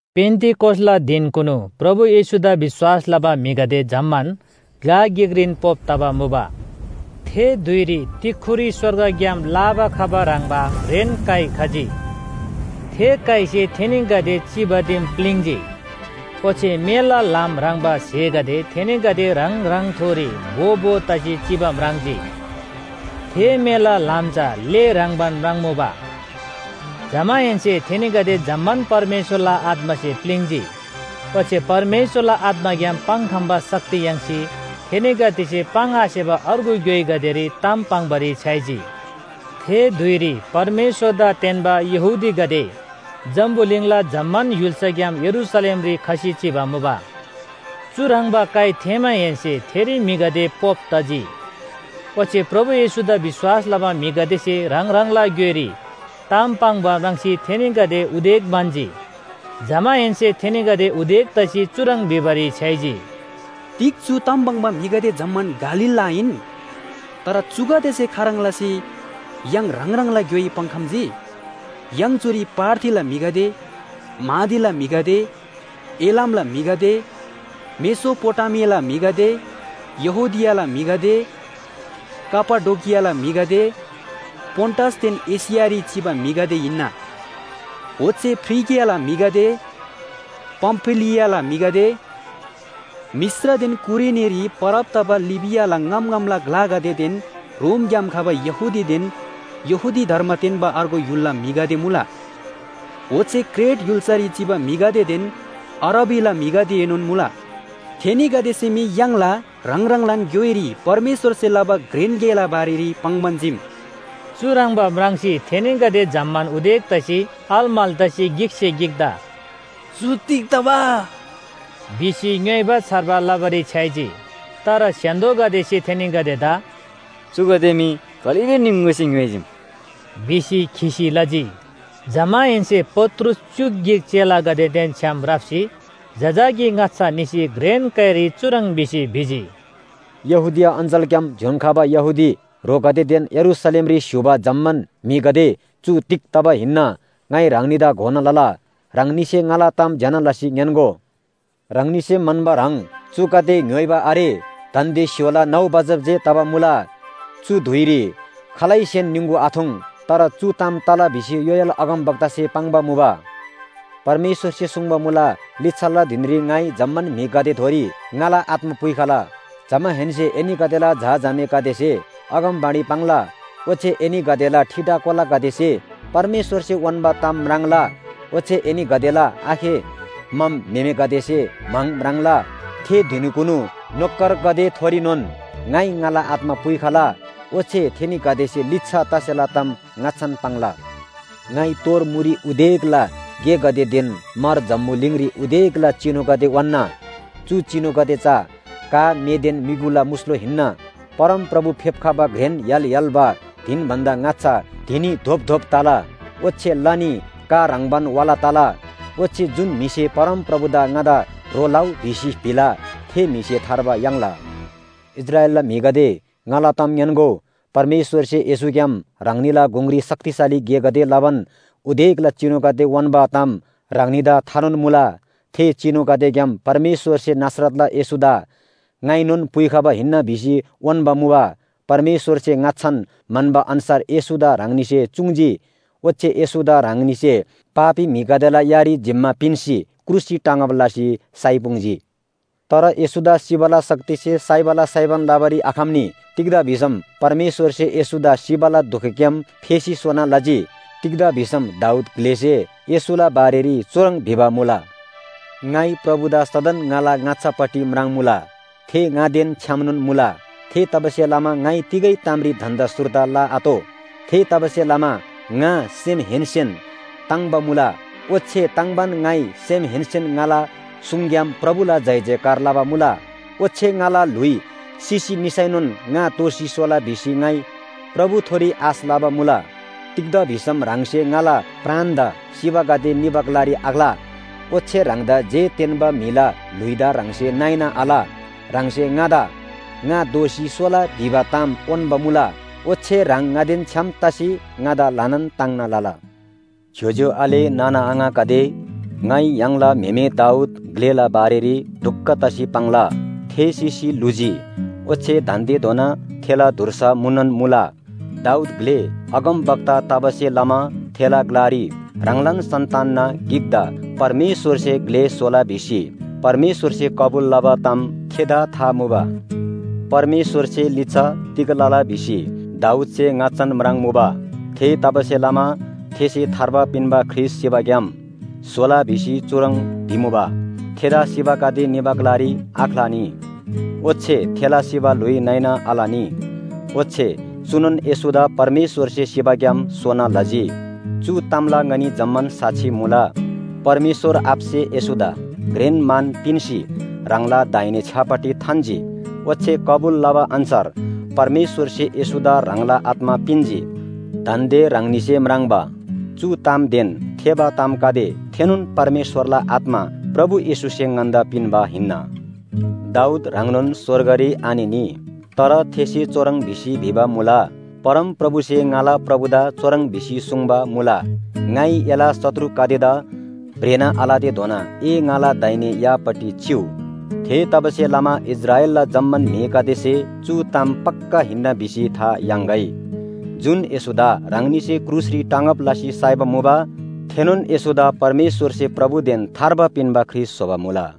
पेन्‍तिकोसला धिनकुनु प्रभु येशूदा विश्‍वास लबा म्‍हिगदे जम्‍मान ग्‍ला गिकरीन पोप तबा मुबा। थे धुइरी तिख्‍खुरी स्‍वर्गग्‍याम लाबा खबा ह्रङ्‌बा घ्रेन काइ खजी। थे काइसे थेनीगदे चिबा दिम प्‍लिङ्‌जी। ओच्‍छे मेला ल्‍हाम ह्रङ्‌बा स्‍हेगदे थेनीगदे ह्राङ ह्राङथोरी भो भो तसी चिबा म्राङ्जी। थे मेला ल्‍हाम चा ले ह्रङ्‌बान म्राङ्‌मुबा। जमाहेन्‍से थेनीगदे जम्‍मान परमेश्‍वरला आत्‍मासे प्‍लिङ्‌जी। ओच्‍छे परमेश्‍वरला आत्‍माग्‍याम पाङ्‌खम्‍बा शक्ति याङ्सी थेनीगदेसे पाङ्‌आसेबा अर्गु ग्‍योइगदेरी ताम पाङ्‌बारी छ्‌याइजी थे धुइरी परमेश्‍वरदा तेन्‍बा यहूदीगदे जम्‍बुलिङला जम्‍मान य्‍हुल्‍साग्‍याम यरूशलेमरी खसी चिबा मुबा। चुह्रङ्बा काइ थेःमाहेन्‍से थेरी म्‍हिगदे पोप तजी। ओच्‍छे प्रभु येशूदा विश्‍वास लबा म्‍हिगदेसे ह्राङ ह्राङला ग्‍योइरी ताम पाङ्बा म्राङ्सी थेनीगदे उदेक म्‍हन्‍जी। जमाहेन्‍से थेनीगदे उदेक तसी चुह्रङ् भिबारी छ्‌याइजी, “तिग चु ताम पाङ्बा जम्‍मान म्‍हिगदे गालीलला आहिन? तर चुगदेसे खाह्रङ् लसी य्‍हाङ ह्राङ ह्राङला ग्‍योइ पाङ्‌खम्‍जी! य्‍हाङ चुरी पार्थीला म्‍हिगदे, मादीला म्‍हिगदे, एलामला म्‍हिगदे, मेसोपोटामीयाला म्‍हिगदे, यहूदियाला म्‍हिगदे, कापाडोकियाला म्‍हिगदे, पोन्‍टसदेन एशियारी चिबा म्‍हिगदे हिन्‍ना। ओच्‍छे फ्रिगियाला म्‍हिगदे, पामफिलियाला म्‍हिगदे, मिश्रदेन कुरेनीरी परब तबा लिबियाला ङाम ङामला ग्‍लागदेदेन रोमग्‍याम खबा यहूदीदेन यहूदी धर्म तेन्‍बा अर्गु य्‍हुलला म्‍हिगदे मुला। ओच्‍छे क्रेट य्‍हुल्‍सारी चिबा म्‍हिगदेदेन अरबीला म्‍हिगदेएनोन मुला, थेनीगदेसे मी य्‍हाङला ह्राङ ह्राङलान ग्‍योइरी परमेश्‍वरसे लबा घ्रेन गेला बारेरी पाङ्‌बान चीम। चुह्रङ्बा म्राङ्सी थेनीगदे जम्‍मान उदेक तसी अलमल तसी गिकसे गिकदा “चु तिग तबा?” भिसी ङ्‌योइबा छार्बा लबारी छ्‌याइजी। तर स्‍य्‍हान्‍दोगदेसे थेनीगदेदा “चुगदे मी कलिलो निङगुसे ङ्‌य्‍होइजीम” भिसी खिसी लजी। जमाहेन्‍से पत्रुस च्‍युक गिक चेलागदेदेन छ्‌याम राप्‍सी जजाकी ङाच्‍छा निसी घ्रेन काइरी चुह्रङ् भिसी भिजी, “यहूदिया अञ्‍चलग्‍याम ज्‍योङ्‍खबा यहूदी ह्रोगदेदेन यरूशलेमरी स्‍य्‍हूबा जम्‍मान म्‍हिगदे चु तिग तबा हिन्‍ना ङाइ ह्राङनीदा घोना लला। ह्राङनीसे ङाला ताम ज्‍यना लसी ङ्‌यान्‍गो। ह्राङनीसे म्‍हन्‍बा ह्रङ् चुगदे ङ्‌य्‍होइबा आरे। दान्‍दे स्‍य्‍होला नौ बजब जे तबा मुला, चु धुइरी खालैसेन निङगु आथुङ्। तर चु ताम तला भिसी योएल अगमवक्तासे पाङ्बा मुबा। ‘परमेश्‍वरसे सुङ्बा मुला, लिच्‍छाला धिनरी ङाइ जम्‍मान म्‍हिगदेथोरी ङाला आत्‍मा पुइखला, जमाहेन्‍से एनीगदेला झा झामेगदेसे अगमवाणी पाङ्ला, ओच्‍छे एनीगदेला ठिटा कोलागदेसे परमेश्‍वरसे उन्‍बा ताम म्राङ्ला, ओच्‍छे एनीगदेला आखे मम म्‍हेमेगदेसे म्‍हाङ म्राङ्ला। थे धिनकुनु नोकरगदेथोरीनोन ङाइ ङाला आत्‍मा पुइखला, ओच्‍छे थेनीगदेसे लिच्‍छा तसेला ताम ङाच्‍छान पाङ्ला। ङाइ तोर मुरी उदेकला गेगदेदेन मार जम्‍बुलिङरी उदेकला चिनुगदे उन्‍ना। चु चिनुगदे चा का, मेदेन म्‍युगुला मुस्‍लो हिन्‍ना। परमप्रभु फेप्‍खबा घ्रेन य्‍हाल य्‍हाल्‍बा धिन भन्‍दा ङाच्‍छा धिनी धोपधोप तला ओच्‍छे लनी का ह्रङ्‌बान वाला तला। ओच्‍छे जुन म्‍हिसे परमप्रभुदा ङादा ह्रो लउ भिसी भिला, थे म्‍हिसे थार्बा याङ्ला।’ “इस्राएलला म्‍हिगदे ङाला ताम ङ्‌यान्‍गो, परमेश्‍वरसे येशूग्‍याम ह्राङनीला गुङरी शक्तिशाली गेगदे लबान उदेकला चिनुगदे उन्‍बा ताम ह्राङनीदा थानोन मुला। थे चिनुगदेग्‍याम परमेश्‍वरसे नासरतला येशूदा ङाइनोन पुइखबा हिन्‍ना भिसी उन्‍बा मुबा। परमेश्‍वरसे ङाच्‍छान म्‍हन्‍बा अन्‍छार येशूदा ह्राङनीसे चुङ्‌जी। ओच्‍छे येशूदा ह्राङनीसे पापी म्‍हिगदेला यारी जिम्‍मा पिन्‍सी क्रुसरी टाँगब लसी साइपुङ्जी। तर येशूदा सिबाला शक्तिसे साइबाला साइबान लबारी आखम्‍नी। तिग्‍दा भिसम परमेश्‍वरसे येशूदा सिबाला दुखग्‍याम फेसी सोना लजी। तिग्‍दा भिसम दाऊद ग्‍लेसे येशूला बारेरी चुह्रङ् भिबा मुला, ‘ङाइ प्रभुदा सदन ङाला ङाच्‍छापट्टि म्राङ्‌मुला। थे ङादेन छ्‌यामनोन मुला। थेतबासेलमा ङाइ तिगै तामरी धन्‍दा सुर्दा लआतोः। थेतबासेलमा ङा सेमहेन्‍सेन ताङ्‍बा मुला, ओच्‍छे ताङ्बान ङाइ सेमहेन्‍सेन ङाला सुङग्‍याम प्रभुला जयजयकार लबा मुला। ओच्‍छे ङाला ल्‍हुइ सिसी निसैनोन ङा दोःसी सोला भिसी ङाइ प्रभुथोरी आश लबा मुला। तिग्‍दा भिसम ह्राङसे ङाला प्राणदा सिबागदे निबा ग्‍लारी आख्‍ला। ओच्‍छे ह्राङदा जे तेन्‍बा म्‍हिला ल्‍हुइदा ह्राङसे नइना आल। ह्राङसे ङादा ङा दोःसी सोला भिबा ताम उन्‍बा मुला, ओच्‍छे ह्राङ ङादेन छ्‌याम तसी ङादा ल्‍हानान ताङ्ना लला।’ “ज्‍योज्‍यो आले नाना आङागदे, ङाइ य्‍हाङला म्‍हेमे दाऊद ग्‍लेला बारेरी ढुक्‍क तसी पाङ्ला। थे सिसी ल्‍हुजी, ओच्‍छे दान्‍देधोना थेला धुर्सा मुनोन मुला। दाऊद ग्‍ले अगमवक्ता तबासे लमा थेला ग्‍लारी ह्राङलान सन्‍तानना गिकदा परमेश्‍वरसे ग्‍ले स्‍होला भिसी परमेश्‍वरसे कबुल लबा ताम थेदा था मुबा। परमेश्‍वरसे लिच्‍छा तिग लला भिसी दाऊदसे ङाच्‍छान म्राङ्‌मुबा। थेतबासेलमा थेसे थार्बा पिन्‍बा ख्रीष्‍ट सिबाग्‍याम सोला भिसी चुह्रङ् भिमुबा, ‘थेदा सिबागदे निबा ग्‍लारी आख्‍लानी ओच्‍छे थेला सिबा ल्‍हुइ नइना आलनी।’ “ओच्‍छे चुनोन येशूदा परमेश्‍वरसे सिबाग्‍याम सोना लजी। चु तामला ङनी जम्‍मान साक्षी मुला। परमेश्‍वर आबासे येशूदा घ्रेन मान पिन्‍सी ह्राङला दाहिने छ्‌यापट्टि थान्‍जी, ओच्‍छे कबुल लबा अन्‍छार परमेश्‍वरसे येशूदा ह्राङला आत्‍मा पिन्‍जी। दान्‍दे ह्राङनीसे म्राङ्बा चु तामदेन थेःबा तामगदे थेनोन परमेश्‍वरला आत्‍मा प्रभु येशूसे ङन्‍दा पिन्‍बा हिन्‍ना। दाऊद ह्राङनोन स्‍वर्गरी आनिनी, तर थेसे चुह्रङ् भिसी भिबा मुला, ‘परमप्रभुसे ङाला प्रभुदा चुह्रङ् भिसी सुङ्बा मुला, ङाइ एला शत्रुगदेदा भ्रेना आलतेधोना ए ङाला दाहिने यापट्टि चिउ’ “थेतबासेलमा इस्राएलला जम्‍मान म्‍हिगदेसे चु ताम पक्‍का हिन्‍ना भिसी था याङ्‌गै, जुन येशूदा ह्राङनीसे क्रुसरी टाँगब लसी साइबा मुबा, थेनोन येशूदा परमेश्‍वरसे प्रभुदेन थार्बा पिन्‍बा ख्रीष्‍ट स्‍होबा मुला।”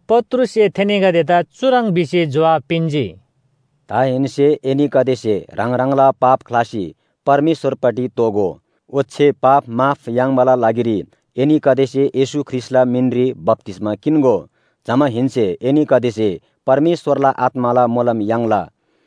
पत्रुससे थेनीगदेदा चुह्रङ् भिसी जोहाब पिन्‍जी, “दाहेन्‍से एनीगदेसे ह्राङ ह्राङला पाप ख्‍लासी परमेश्‍वरपट्टि दोःगो। ओच्‍छे पाप माफ याङ्बाला लागिरी एनीगदेसे येशू ख्रीष्‍टला मिनरी बप्‍तिस्‍मा किन्‍गो। जमाहेन्‍से एनीगदेसे परमेश्‍वरला आत्‍माला मोलम याङ्ला।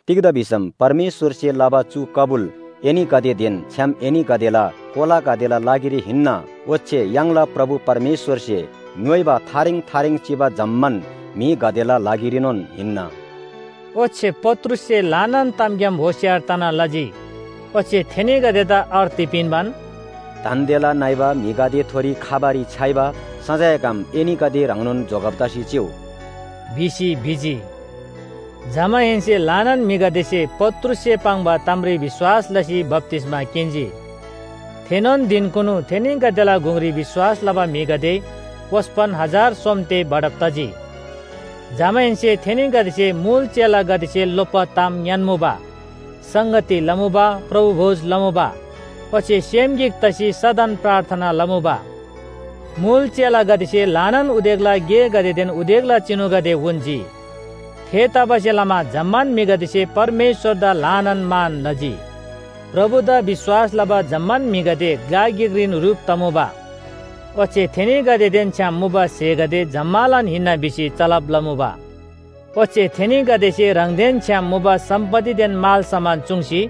तिग्‍दा भिसम परमेश्‍वरसे लबा चु कबुल एनीगदेदेन छ्‌याम एनीगदेला कोलागदेला लागिरी हिन्‍ना, ओच्‍छे य्‍हाङला प्रभु परमेश्‍वरसे ङ्‌योइबा थारेङ थारेङ चिबा जम्‍मान म्‍हिगदेला लागिरीनोन हिन्‍ना।” ओच्‍छे पत्रुससे ल्‍हानान तामग्‍याम होशियार तना लजी। ओच्‍छे थेनीगदेदा अर्ती पिन्‍बान, “दान्‍देला नइबा म्‍हिगदेथोरी खबारी छ्‌याइबा सजायग्‍याम एनीगदे ह्राङनोन जोगब तसी चिउ” भिसी भिजी। जमाहेन्‍से ल्‍हानान म्‍हिगदेसे पत्रुससे पाङ्बा तामरी विश्‍वास लसी बप्‍तिस्‍मा किन्‍जी। थेनोन धिनकुनु थेनीगदेला गुङरी विश्‍वास लबा म्‍हिगदे ओस्‍पन हजार सोम ते बढब तजी। जमाहेन्‍से थेनीगदेसे मुल चेलागदेसे लोप्‍बा ताम ङ्‌यान्‍मुबा, संगती लमुबा, प्रभु भोज चमुबा, ओच्‍छे सेम गिक तसी सदन प्रार्थना लमुबा। मुल चेलागदेसे ल्‍हानान उदेकला गेगदेदेन उदेकला चिनुगदे उन्‍जी। थेतबासेलमा जम्‍मान म्‍हिगदेसे परमेश्‍वरदा ल्‍हानान मान लजी। प्रभुदा विश्‍वास लबा जम्‍मान म्‍हिगदे ग्‍ला गिकरीन ह्रुप तमुबा, ओच्‍छे थेनीगदेदेन छ्‌याम मुबा स्‍हेगदे जम्‍मालान हिन्‍ना भिसी चलब लमुबा। ओच्‍छे थेनीगदेसे ह्राङदेन छ्‌याम मुबा सम्‍पत्तिदेन मालसामान चूङ्सी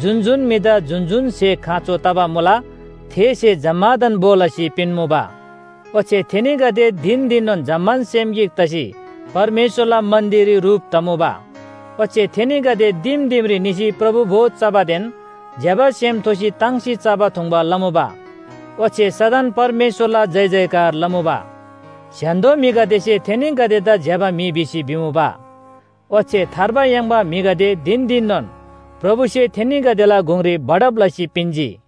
जुन जुन म्‍हिदा जुन जुन स्‍हे खाँचो तबा मुला थे स्‍हे जम्‍मादान भो लसी पिन्‍मुबा। ओच्‍छे थेनीगदे धिन धिननोन जम्‍मान सेम गिक तसी परमेश्‍वरला मन्‍दिररी ह्रुप तमुबा। ओच्‍छे थेनीगदे दिम दिमरी निसी प्रभु भोज चबादेन ज्‍यबा सेम थोसी ताङ्सी चबा थुङ्बा लमुबा। ओच्‍छे सदन परमेश्‍वरला जयजयकार लमुबा। स्‍य्‍हान्‍दो म्‍हिगदेसे थेनीगदेदा ज्‍यबा म्‍हि भिसी भिमुबा। ओच्‍छे थार्बा याङ्बा म्‍हिगदे धिन धिननोन प्रभुसे थेनीगदेला गुङरी बढब लसी पिन्‍जी।